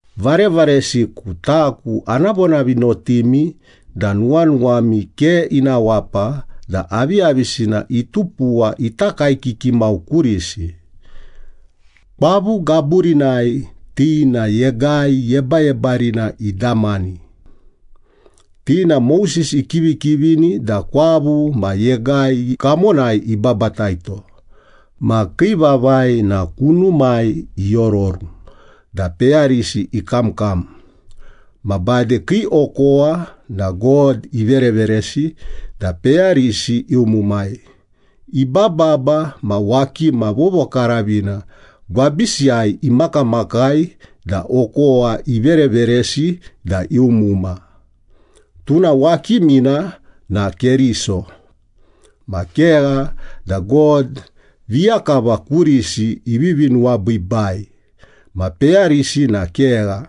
Varevaresiku, taku ana vonavinotimi da nuwanuwami ke ina wapa da aviyavisina itupuwa ita kaekiki mau kurisi. Kwavu gaburinai ti na Yegai Yebayebarina idamani. Ti na Moses ikivikivini da kwavu ma yegai kamonai ibabataito. Ma kii vavai na kunumai iororu da peyarisi ikamkam, ma bade kii okowa na God ivereveresi da peyarisi iumumai. Ibababa ma wakima vovokaravina gwabisiyai imakamakai da okowa ivereveresi da iumuma. Tuna wakimina na Keriso. Ma kegha da God viya kava kurisi ivivi nuwabiibai ma peyarisi na kegha.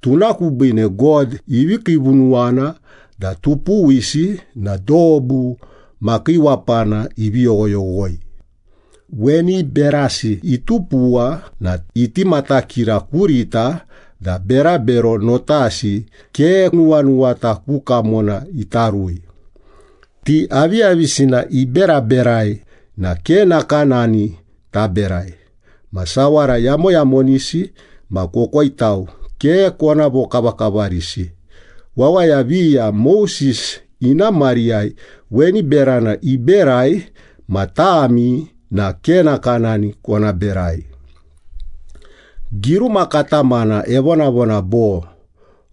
Tuna kubiine God ivi kiivunuwana da tupuwisi na dobu makiiwapana ivi yoghoyoghoi. Weni berasi itupuwa na iti matakira kurita da berabero notasi ke nuwanuwata ku kamona ita rui. Ti aviyavisina iberaberai na ke nakanani taberai. Ma sawara yamoyamonisi ma kokoitau ke kona vokavakavarisi. Wawaya viya Moses ina mariyai weni berana iberai ma tami na ke nakanani kona berai. Giruma katamana evonavona bo,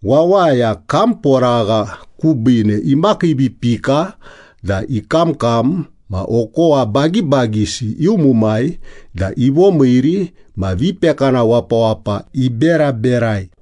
“Wawaya kamporagha kubiine imakiivipika da ikamkam ma okowa bagibagisi iumumai da ivomiiri ma vipekana wapawapa iberaberai.”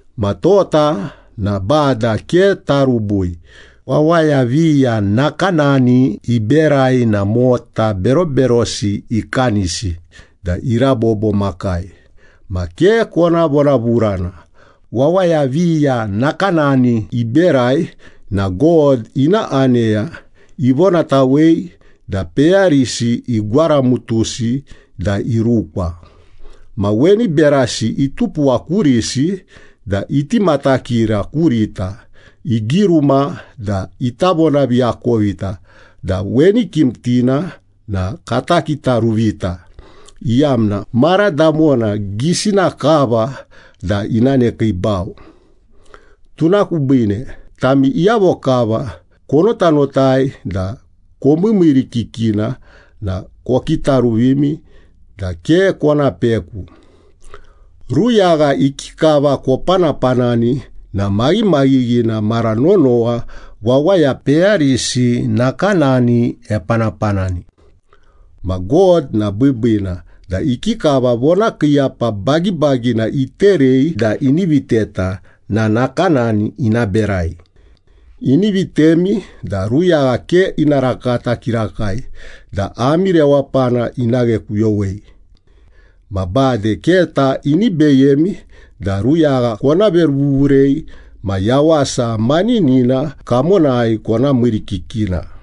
Ma tota na Bada ke tarubui. Wawaya viya nakanani iberai na mota beroberosi ikanisi da irabobo makai. Ma ke kona vonavurana. Wawaya viya nakanani iberai na God ina aneya ivonatawei da peyarisi igwaramutusi da irukwa. Ma weni berasi itupuwa kurisi da iti matakira kurita. Igiruma da ita vonaviakovita da weni kimtina na takitaruvita, iyamna mara damona gisina kava da ina nekiibau. Tuna kubiine tami iyavo kava konotanotai da komiimiirikikina na kokitaruvimi da ke kona peku. Ruyagha ikikava kopanapanani na maghimaghighina mara nonowa wawaya peyarisi nakanani epanapanani. Ma God na biibiina da ikikava vonakiiyapa bagibagina iterei da ini viteta na nakanani ina berai. Ini vitemi da ruyagha ke ina rakata kirakai da ami rewapana ina ghekuyowei. Ma bade keta ini beyemi da ruyagha kona veruvuvurei ma yawasa maninina kamonai kona miirikikina.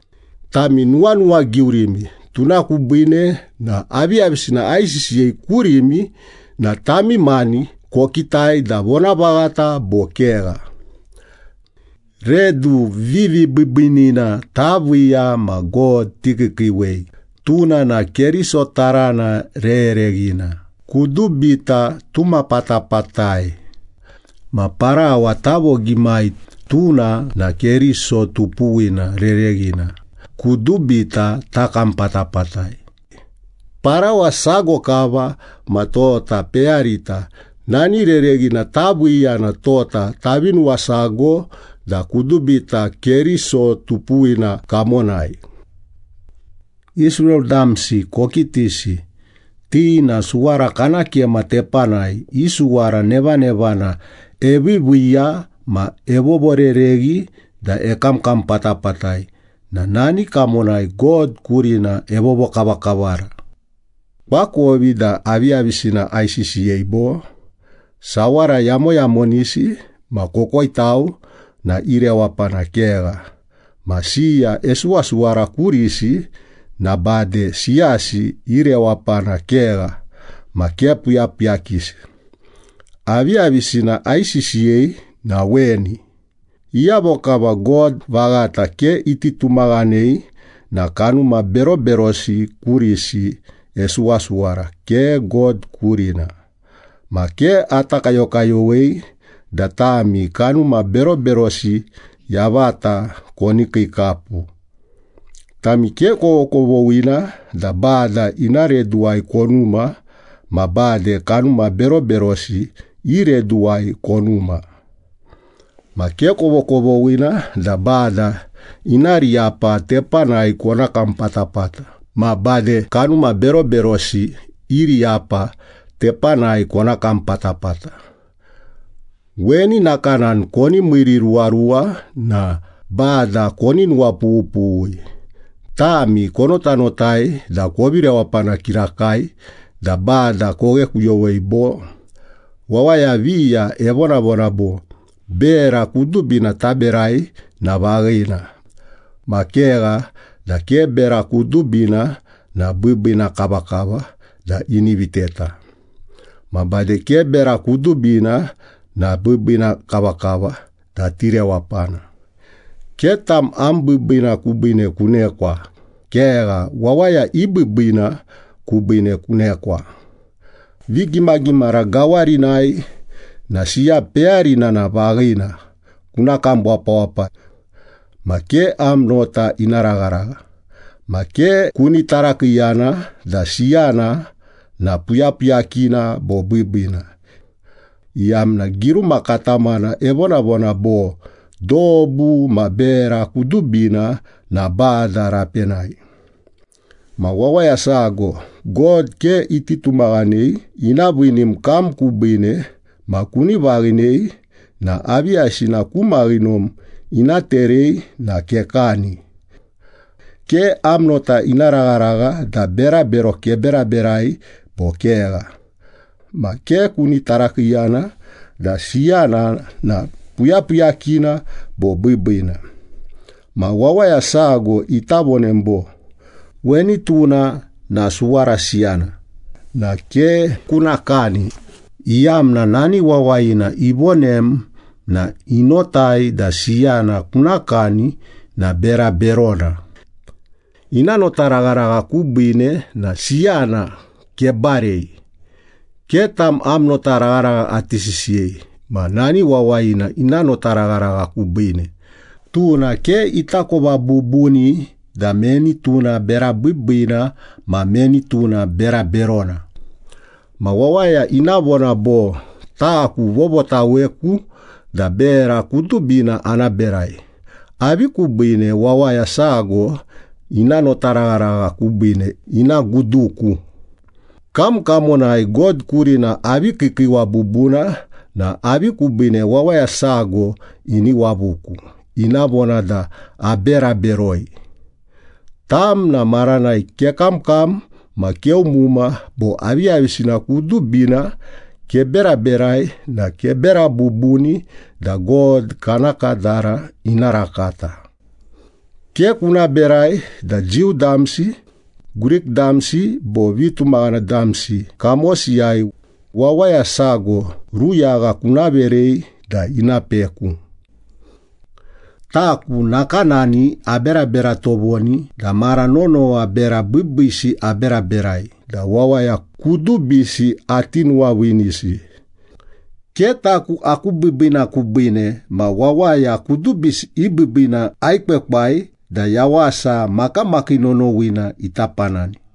Tami nuwanuwagiurimi, tuna kubiine na aviyavisina aisisiyei kurimi na tami mani kokitai da vonavaghata bo kegha. Redu vivibiibiinina taviiya ma God tikiikiiwei, tuna na Keriso tarana rereghina, kudubita tuma patapatai. Ma parawa tavogimai, tuna na Keriso tupuwina rereghina, kudubita takam patapatai. Parawa sago kava ma tota peyarita nani rereghina taviiya na tota tavi nuwasago da kudubita Keriso tupuwina kamonai. Israel damsi kokitisi, ti na suwara kana kema tepanai i suwara nevanevana eviiviiya ma evovorereghi da ekamkam patapatai na nani kamonai God kurina evovokavakavara. Koakovi da aviyavisina aisisiyei, bo? Sawara yamoyamonisi ma kokoitau na i rewapana kegha. Ma siya esuwasuwara kurisi na bade siyasi i rewapana kegha ma ke puyapuyakisi. Aviyavisina aisisiyei na weni, iyavo kava God vaghata ke iti tumaghanei na kanuma beroberosi kurisi esuwasuwara, ke God kurina. Ma ke ata kayokayowei da tami kanuma beroberosi yavata koni kiikapu. Tami ke kovokovoghina da Bada ina reduwai konuma ma bade kanuma beroberosi i reduwai konuma. Ma ke kovokovoghina da Bada ina riyapa tepanai kona kam patapata ma bade kanuma beroberosi i riyapa tepanai kona kam patapata. Weni nakanani koni miiriruwaruwa na Bada koni nuwapughupughui. Tami konotanotai da kovi rewapana kirakai da Bada koghekuyowei bo? Wawaya viya evonavona bo, “Bera kudubina taberai na vaghina.” Ma kegha da ke bera kudubina na biibiina kavakava da ini viteta. Ma bade ke bera kudubina na biibiina kavakava da tirewapana. Ke tam am biibiina kubiine kunekwa. Kegha, wawaya i biibiina kubiine kunekwa. Vigimagimara gawarinai na siya peyarina na vaghina, kuna kam wapawapa. Ma ke am nota ina ragharagha ma ke kuni tarakiiyana da siyana na puyapuyakina bo biibiina, iyamna giruma katamana evonavona bo, “Dobu ma bera kudubina na Bada rapenai.” Ma wawaya sago God ke iti tumaghanei ina viinim kam kubiine ma kuni vaghinei na aviyavisina ku maghinom ina terei na kekani. Ke am nota ina ragharagha da berabero keberaberai bo kegha. Ma ke kuni tarakiiyana da siyana na puyapuyakina bo biibiina. Ma wawaya sago ita vonem bo, “Weni tuna na suwara siyana,” na ke kuna kani, iyamna nani wawayina ivonem na inotai da siyana kuna kani na bera berona. Ina notaragharagha kubiine na siyana kebarei. Ke tam am notaragharagha ati sisiyei, ma nani wawayina ina notaragharagha kubiine. Tuna ke itakova bubuni da meni tuna bera biibiina ma meni tuna bera berona. Ma wawaya ina vona bo, “Taku vovotaweku da bera kudubina ana berai. Avi kubiine wawaya sago ina notaragharagha kubiine ina guduku? Kam kamonai God kurina avi kiikiiwa bubuna na avi kubiine wawaya sago ini wavuku, ina vona da abera beroi?” Tam na maranai kekamkam ma keumuma bo aviyavisina kudubina keberaberai na kebera bubuni da God kana kadara ina rakata. Ke kuna berai da Jiu damsi, Grik damsi bo vitumaghana damsi kamosiyai, wawaya sago ruyagha kuna verei da ina peku. Taku nakanani aberabera tovoni da mara nonowa bera biibiisi aberaberai da wawaya kudubisi ati nuwaviinisi. Ke taku aku biibiina kubiine ma wawaya kudubisi i biibiina aekwekwai da yawasa makamakii nonowina ita panani.